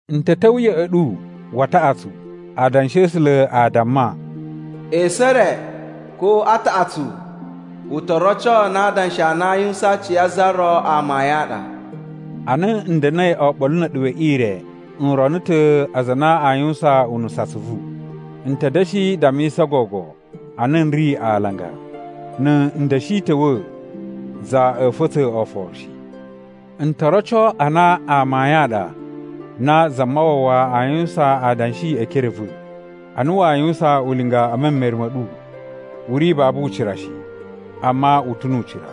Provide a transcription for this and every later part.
N ta̱ ta̱wa̱ ya̱ꞌa̱ ɗu wa taꞌatsu. Adanshi a A̱sula̱ a damma, “Esu e re ko a taꞌatsu u to roco na adanshi a na a yuwusan a aci a za ro amayun a ɗa.” Ana n da̱na̱i oɓolo na̱ a̱ɗu we ire, n rono ta̱ aza a na a yuwusan unusu atsuvu. N ta̱ da̱shi dammisa gogo a na n ri alanga: Na̱ n da̱shi ta̱wa̱, za a̱a̱ fa̱tsa̱ oforo shi. N to roco a na amayun a ɗa na Zamawawa aa yuwusan adanshi e ekere a̱ va̱. Ana waa yuwusan ulinga e memere ma̱ ɗu, u ri babu ucira shi, amma u ta̱ nu ucira.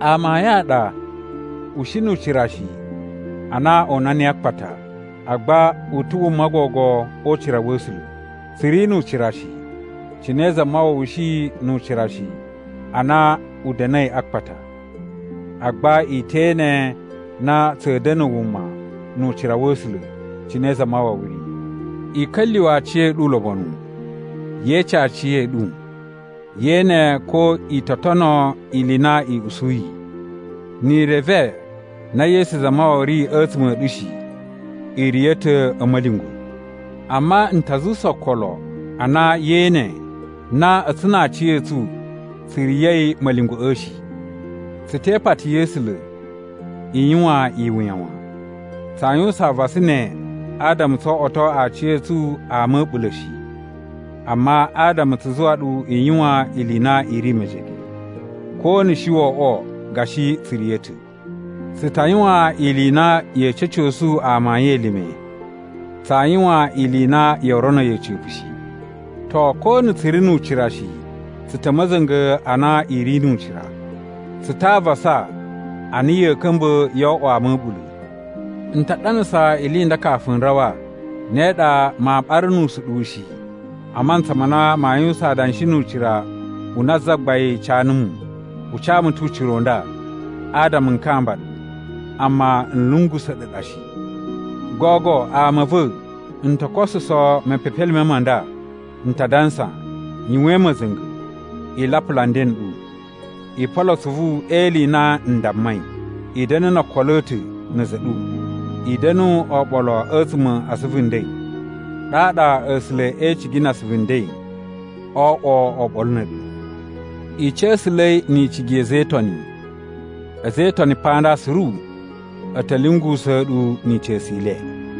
Amayun a ɗa u shi nu ucira shi ana o una niyi a akpata, agba u ta̱ wuma gogo o ucira wa̱ A̱sula̱. Tsu ri nu ucira shi, cine Zamawawa shi nu ucira shi ana u da̱na̱i a akpata. Agba i te ene na tsa̱a̱ da̱na̱ wuma nu ucira wa̱ A̱sula̱, cine Zamawawa ri. I ka̱lyuwa̱ aciya̱ɗu ulobonu. Ye ece aciya̱ɗu ye ene ko i to tono ili i na i usuyi. Ni i reve na Yesu Zamawawa ri a̱tsuma̱ a̱ ɗu shi, i riya̱ ta̱ a̱ ma̱lyungwa̱. Amma n ta zuwusa okolo a na yee ene na a̱tsu na aciya̱tsu tsu riya̱i ma̱lyungwa̱ꞌa̱ shi. Tsu te ipati ya̱ A̱sula̱ i yuwan iwuya wan. Tsaa yuwusan avasa ne adama tso oꞌwoto aciya̱tsu ama a̱ a̱ɓula̱ shi, amma adama tsu zuwa ɗu i yuwan ili i na i ri mejege, ko na̱ shi wo oꞌwo gashi tsu riya̱ ta̱. Tsu ta yuwan ili i na ya̱a̱ ca̱cosu amayun elime. Tsaa yuwan ili i na yoo rono yi a̱ca̱pa̱ shi. To ko na̱ tsu ri nu ucira shi, tsu ta̱ ma̱za̱nga̱ a na i ri nu ucira. Tsu ta a avasa a na ya̱a̱ ka̱mba̱ yoo oꞌwo ama a̱ a̱ɓula̱. N ta ɗanasa ili i nda kafu n rawa. Ne ɗa maa ɓara nu usuɗuwu shi a mantsa ma na maa yuwusan adanshi nu ucira u na Zagbain ca numu. U ca mu ta̱ ucira u nda, adama n kamba ɗu, amma n lungusa̱ ɗu ɗa shi. Gogo ama a̱ va̱, n to kosuso mepepelime ma nda. N ta dansa: Yuwain ma̱za̱nga̱! I lapula nden n ɗu. I polo atsuvu e ili i na n dammai. I da̱na̱ no okolo a̱ ta̱ na̱ a̱za̱ a̱ ɗu. I da̱nu oɓolo a̱tsuma̱ a asuvu nden. Ɗaɗa A̱sula̱ e icigi na asuvu nden oo oꞌwo oɓolo na̱ a̱ɗu. I ca̱sa̱la̱i ni icigi ya̱ a̱za̱ e Itoni. A̱za̱ e Itoni pa nda suru a̱ ta̱ lyungusa̱a̱ ɗu ni ica̱su i le.